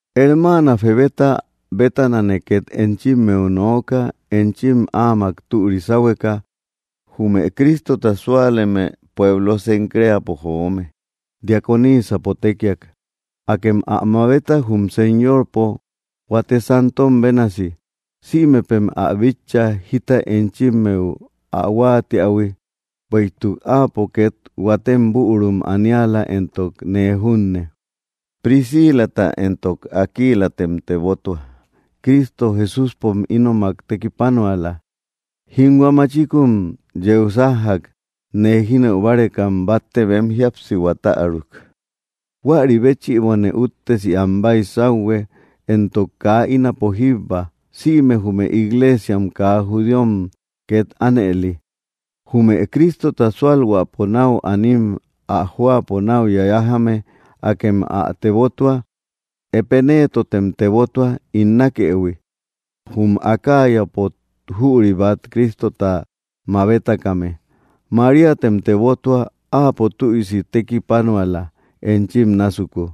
Hermaana Febeta bétanane két enchimmeu nooka, enchim áamak türi sáhueka, jume Cristota súaleme pueblo Cencreapo joome; diaconisapo tékiak. Akem ä mabeta jum Señorpo, huate santom bénasi. Sïmepem ä bitcha, jita enchimmeu ä huáatiähui; bueïtuk áapo ket huatem bürum aniala, entok nee junne. Priscilata entok Aquilatem tebotua; Cristo Jesúspom ínomak tekipanuala. Jínhua machikun yeu sájjak, nee jínëu bárekam batte bem jíapsihua täruk. Huäri béchïbone úttesi am baysauhue, entok kaa ínapo jíbba sïme jume iglesiam kaa judíom két ánëli. Jume Cristota sualhuäpo nau anim ä jóapo náu yayajame, akem ä tebotua. Epenetotem tebotua, ín nákëhui, jum Acayapo jüri bat Cristota mabetakame. Maríatem tebotua; áapo tüisi tekipanuala, enchim násuku.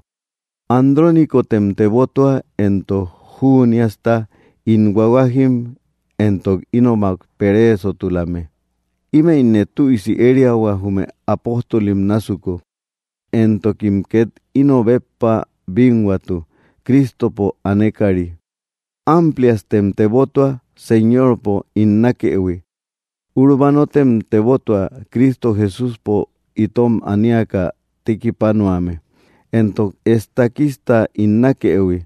Andrónicotem tebotua, entok Juniasta, ín huahuajim entok ínomak pereesotulame. Ímëine tüisi ériahua jume apóstolim násuku, entokim két íno béppa bínhuatu Cristopo anekari. Ampliastem tebotua, Señorpo ín nákëhui. Urbanotem tebotua, Cristo Jesúspo itom aniaka tekipanuame, entok Estaquista, ín nákëhui.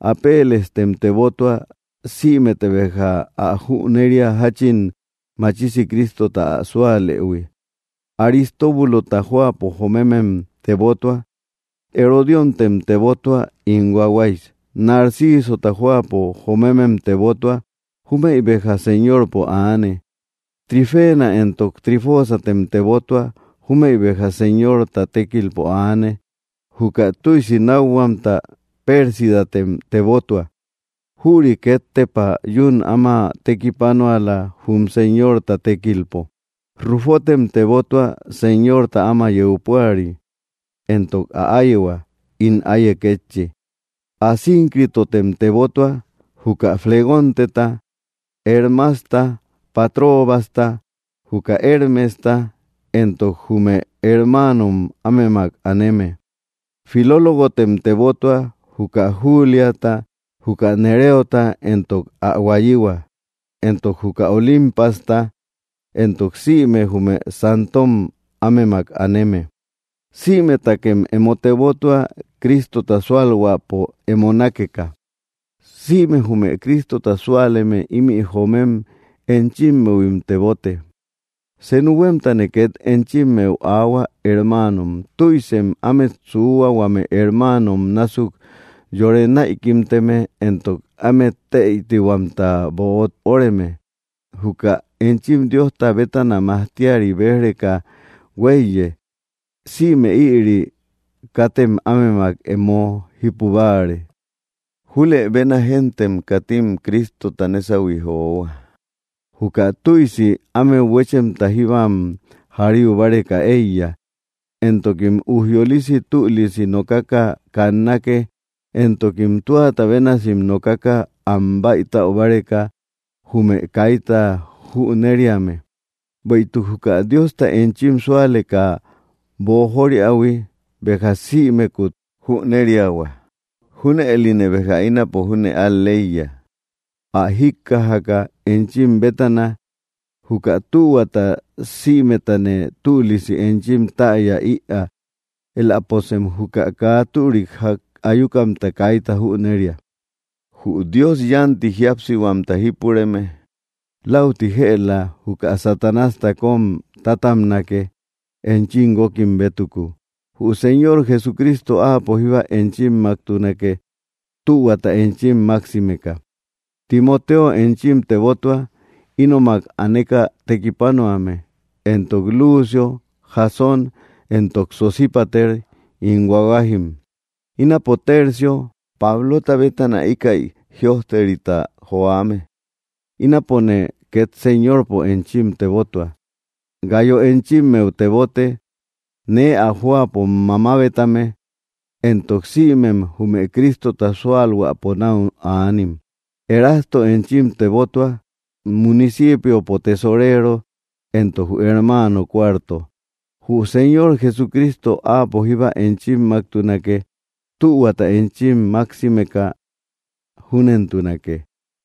Apelestem tebotua. Sïmete béja ä jüneria, jáchin machisi Cristota ä súalëhui; Aristóbulota jóapo joomemem tebotua. Herodióntem tebotua, ín huahuay. Narcisota jóapo jomemem tebotua; júmëi béja Señorpo aane. Trifena entok Trifosatem tebotua; júmëi béja Señorta tékilpo aane. Juka tüisi nákhuamta Pérsidatem tebotua; jüri két tepa yún áma tekipanuala, jum Señorta tékilpo. Rufotem tebotua, Señorta áma yeu púari, entok ä áyehua, ín áiye kétchi. Asíncritotem tebotua, juka Flegonteta, Hermasta, Patrobasta, juka Hermesta, entok jume hermaanom ámemak aneme. Filólogotem tebotua, juka Juliata, juka Nereota, entok ä huayihua, entok juka Olimpasta entok sïme jume santom ámemak aneme. Sïmetakem emo tebotua, Cristota sualhuäpo emo nakeka. Sïme jume Cristota súaleme ímï joomem enchimmehuim tebote. Senu huémtane két enchimmeu aahua, hermaanom, tüisem ámet suuhua, huame hermaanom násuk yore näikimteme, entok ámet tëitihuamta böot óreme, juka enchim Diosta bétana majtiari béj‑reka huéiye. Sïme ïri, katem ámemak emo jípu báare. Julëbena géntem katim Cristota nésahui johua; juka tüisi ámeu huéchemta jíbam jariu báreka eíya, entokim ujyolisi tülisi nokaka kannake, entokim tuata bénasim nokaka am baïtaubáreka, jume kaita jünereame. Bueïtuk juka Diosta enchim súaleka boojoriähui, béja sïmekut jüneriahua. Júnëline béja ínapo júne al‑leiya, ä jíkkajaka enchim bétana. Juka tühuata sïmetane tülisi enchim täya ïaa; éläposem juka kaa türik jak ayukamta kaita jüneria. Jü Dios yánti jíapsihuamta jípureme läuti jëla juka Satanásta kóm tátabnake, enchim guókim bétuku. Jü Señor Jesucristo Áapo jíba enchimmaktunake, tühuata enchim maksimeka. Timoteo enchim tebotua, ínomak aneka tekipanuame, entok Lucio, Jasón entok Sosípater, ín huahuajim. Ínapo Tercio, Pablota bétana íkäi jïojterita johuame, ínapone két Señorpo, enchim tebotua. Gayo enchimmeu tebote, nee ä jóapo mamabetame, entok sïmem jume Cristota sualhuäpo nau anim. Erasto enchim tebotua, municipiopo tesorero, entok jü hermaano Cuarto. Jü Señor Jesucristo, Áapo jíba enchimmaktunake, tühuata enchim maksimeka. Júnentunake.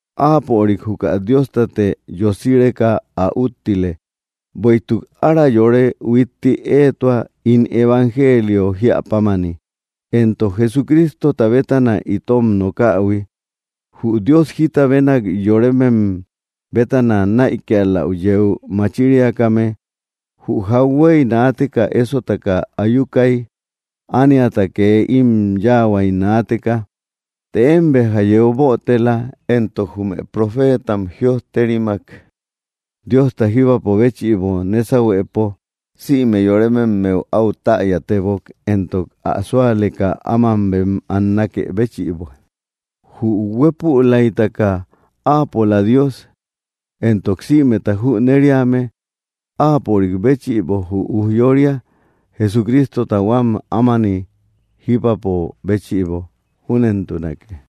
¡Áapörik juka Diostate yosireka ä úttile! ¡Bueïtuk ára yore huitti éetua, ín evangelio jíä pámani, entok Jesucristota bétana itom nokähui! Jü Dios jita benak yoremem bétana naïkialäu yeu machiriakame, jü jauhuey naateka ésotaka ayukay, ániata kee im yáahuay naateka. Të én béja yeu bötela, entok jume profeetam jïojterimak, Diosta jíbapo béchïbo nésahuepo, sïme yorememmeu áu täyatebok, entok ä súaleka áma bem annakë béchïbo. ¡Jü huépülaytaka Áapola Dios, entok sïmeta jüneriame, Áapörik béchïbo jü ujyória Jesucristota huám ámani jíbapo béchïbo! Júnentunake.